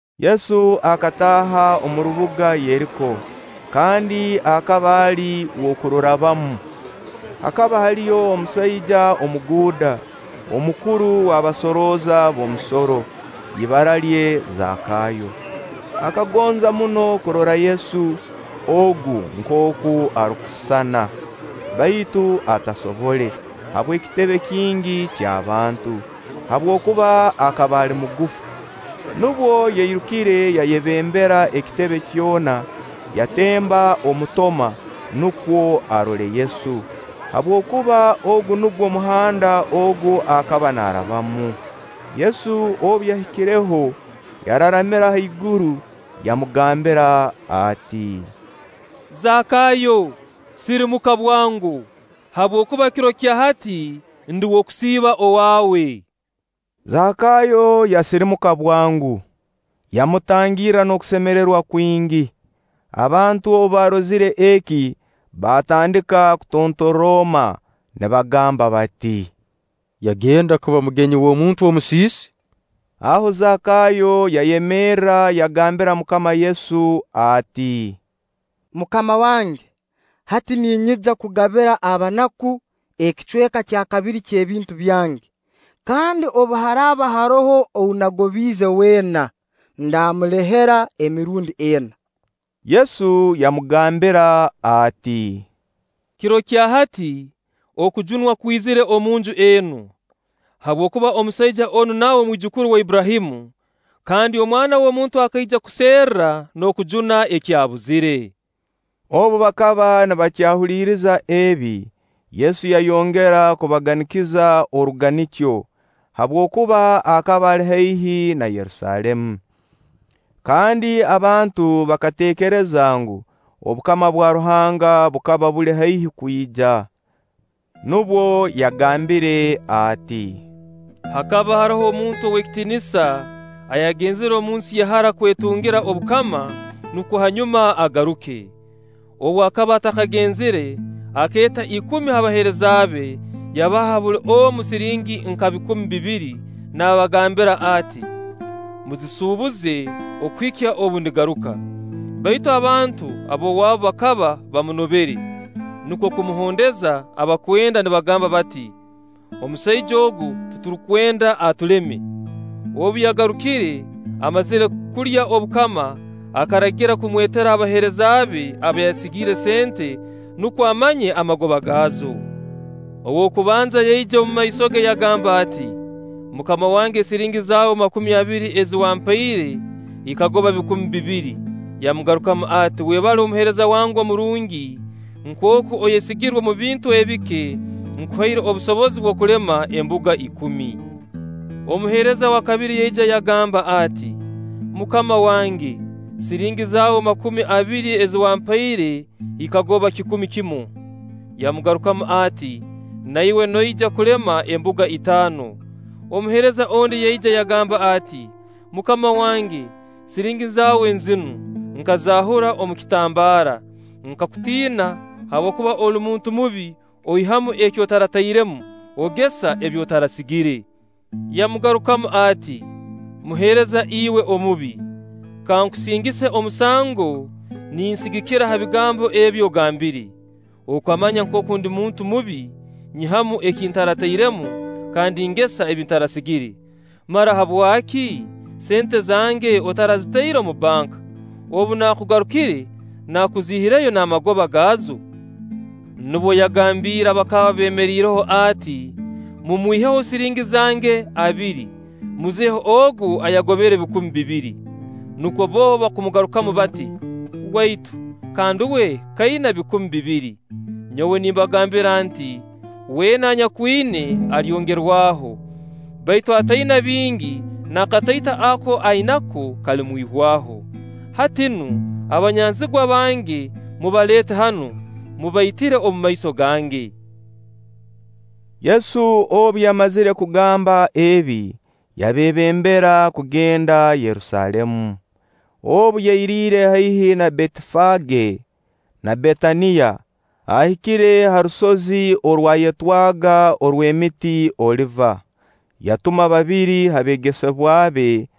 Yesu akataaha omu rubuga Yeriko, kandi akaba ali w'okururabamu. Hakaba haliyo omusaija omuguuda, omukuru w'abasorooza b'omusoro, ibara lye Zakayo. Akagonza muno kurora Yesu ogu nkooku arukusisana, baitu atasobole, habw'ekitebe kingi ky'abantu, habwokuba akaba ali mugufu. Nubwo yairukire yayebembera ekitebe kyona, yatemba omutoma, nukwo arole Yesu, habwokuba ogu nugwo muhanda ogu akaba naarabamu. Yesu obu yahikireho yararamira haiguru, yamugambira ati: “Zakayo, sirimuka bwango, habwokuba kiro kya hati ndi w'okusiiba owaawe.” Zakayo yasirimuka bwango, yamutangirra n'okusemererwa kwingi. Abantu obu baarozire eki baatandika kutontoroma nibagamba bati: “Yagenda kuba mugenyi w'omuntu omusiisi!” Aho Zakayo yayemerra yagambira MUKAMA Yesu ati: “Mukama wange, hati ninyija kugabira abanaku ekicweka kya kabiri ky'ebintu byange; kandi obu haraaba haroho ou nagobiize weena, ndamulehera emirundi ena.” Yesu yamugambira ati: “Kiro kya hati okujunwa kwizire omunju enu, habwokuba omusaija onu nawe mwijukuru wa Abburahamu; kandi Omwana w'omuntu akaija kuserra n'okujuna ekyabuzire.” Obu bakaba nibakyahuliriza ebi, Yesu yayongera kubaganikiza oruganikyo, habwokuba akaba ali haihi na Yerusaalemu, kandi abantu bakateekereza ngu, obukama bwa Ruhanga bukaba buli haihi kwija. Nubwo yagambire ati: “Hakaba haroho omuntu ow'ekitiinisa ayagenzire omu nsi ya hara kwetungira obukama, nukwo hanyuma agaruke. Obu akaba atakagenzire, akeeta ikumi ha baheereza be, yabaha buli omu siringi nka bikumi bibiri, naabagambira ati: ‘Muzisuubuze okuhikya obu ndigaruka.’ Baitu abantu b'owaabu bakaba bamunobere, nukwo kumuhondeza abakwenda nibagamba bati: ‘Omusaija ogu titurukwenda atuleme.’ “Obu yagarukire, amazire kulya obukama, akaragira kumwetera abaheereza be aba yasigiire sente, nukwo amanye amagoba gaazo. Ow'okubanza yaija omu maiso ge yagamba ati: ‘Mukama wange, siringi zaawe makumi abiri ezi wampaire ikagoba bikumi bibiri.’ Yamugarukamu ati: ‘Webale muheereza wange omurungi! Nkooku oyesigirwe omu bintu ebike, nkuhaire obusobozi bw'okulema embuga ikumi.’ Omuheereza wa kabiri yaija yagamba ati: ‘Mukama wange, siringi zaawe makumi abiri ezi wampaire ikagoba kikumi kimu.’ Yamugarukamu ati: ‘Na iwe noija kulema embuga itaano.’ Omuheereza ondi yaija yagamba ati: ‘Mukama wange, siringi zaawe nzinu, nkazaahura omu kitambaara. Nkakutiina, habwokuba oli muntu mubi; oihamu eki otaratairemu, ogesa ebi otarasigire.’ Yamagarukamu ati: ‘Muheereza iwe omubi! Kankusingise omusango ninsigikira ha bigambo ebi ogambire! Okamanya nkooku ndi muntu mubi, nyihamu eki ntaratairemu, kandi ngesa ebi ntarasigire! Mara habwaki sente zange otarazitaire omu banka? Obu nakugarukire naakuziihireyo n'amagoba gaazo?’ Nubwo yagambiire abakaba beemeriireho ati: ‘Mumwiheho siringi zange abiri, muzihe ogu ayagobere bikumi bibiri.’ Nukwo bbo kumugambira bati: ‘Waitu, kandi uwe k'aina ebikumi bibiri!’ Nyowe nimbagambira nti: ‘Weena anyakwina, alyongerwaho; baitu ataina bingi, n'akatoito aka ainako kalimwihwaho. Hati nu, abanyanzigwa bange mubaleete hanu, mubaitire omumaiso gange!’” Yesu obu yamazire kugamba ebi, yabeebembera kugenda Yerusaalemu. Obu yairiire haihi na Beetifage na Betaniya, ahikire ha rusozi orwayetwaga orw'emiti Oliva, yatuma babiri ha beegesebwa be,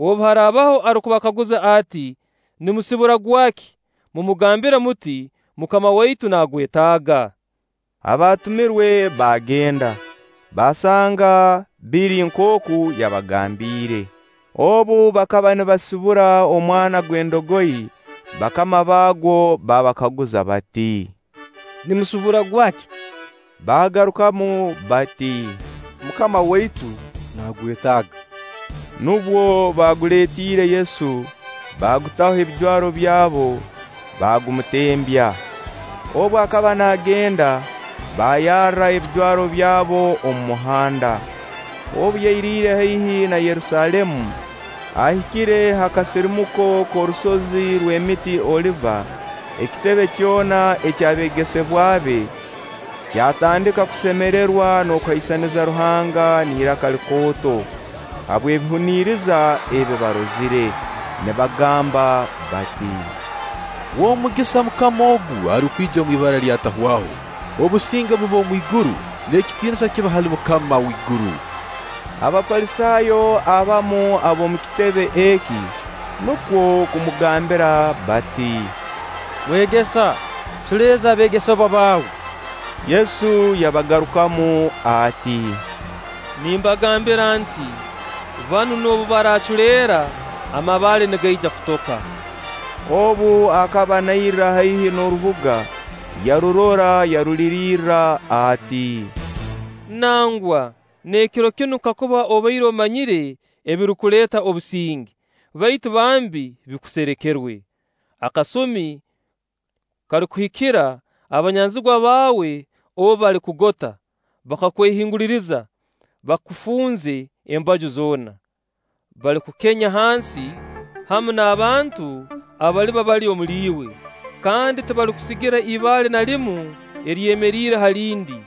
Obu haraabaho arukubakaguza ati: ‘Nimusibura gwaki?’ Mumugambire muti: ‘Mukama waitu nagwetaaga.’” Abaatumirwe baagenda, baasanga biri nkooku yabagambiire. Obu bakaba nibasibura omwana gw'endogoyi' bakama baagwo baabakaguza bati: “Nimusibura gwaki?” Baagarukamu bati: “Mukama waitu nagwetaaga.” Nubwo baaguleetiire Yesu, baagutaho ebijwaro byabo, bagumutembya. Obu akaba naagenda, baayarra ebijwaro byabo omu muhanda. Obu yairiire haihi na Yerusaalemu, ahikire ha kasirimuko k'orusozi rw'emiti Oliva, ekitebe kyona eky'abeegesebwa be kyatandika kusemererwa n'okuhaisaniza Ruhanga n'iraka likooto habw'ebihuniriza ebi baarozire, nibagamba bati: “W'omugisa MUKAMA ogu arukwija omu ibara lya Atahwaho. Obusinge bube omwiguru, n'ekitiinisa kibe hali Mukama w'iguru!” Abafalisaayo abamu ab'omu kitebe eki, nukwo kumugambira bati: “Mwegesa, culeeza abeegesebwa baawe!” Yesu yabagarukamu ati: “Nimbagambira nti: Banu noobu baraaculeera, amabaale nigaija kutoka.” Obu akaba nairra haihi n'orubuga, yarurora, yarulirirra ati: “Nangwa n'ekiro kinu kakuba obaire omanyire ebirukuleeta obusinge! Baitu bambi, bikuserekerwe! Akasumi kalikuhikira abanyanzigwa baawe obu balikugota, bakwehingulirize, bakufunze embaju zoona. Balikukenya hansi hamu n'abantu abaliba bali omuliiwe, kandi tibalikusigira ibaale na limu eryemeriire ha lindi;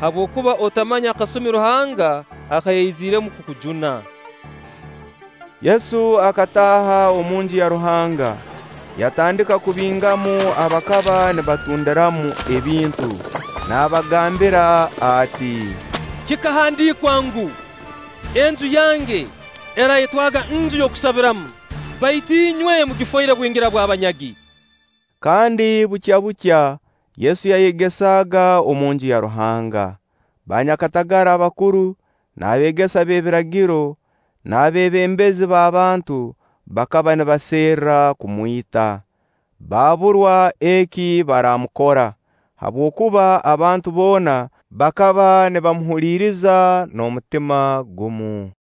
habwokuba otamanye akasumi Ruhanga aka yaiziremu kukujuna!” Yesu akataaha omunju ya Ruhanga, yatandika kubingamu abakaba nibatundiramu ebintu, naabagambira ati: “Kikahandiikwa ngu: ‘Enju yange eraayetwaga Nju y'okusabiramu’; baitu inywe mugifoire bwingira bw'abanyagi!” Kandi bukyabukya Yesu yayegesaaga omunju ya Ruhanga. Baanyakatagara abakuru, n'abeegesa b'ebiragiro, n'abeebembezi b'abantu bakaba nibaserra kumwita, baaburwa eki baraamukora, habwokuba abantu boona bakaba nibamuhuliiriza n'omutima gumu.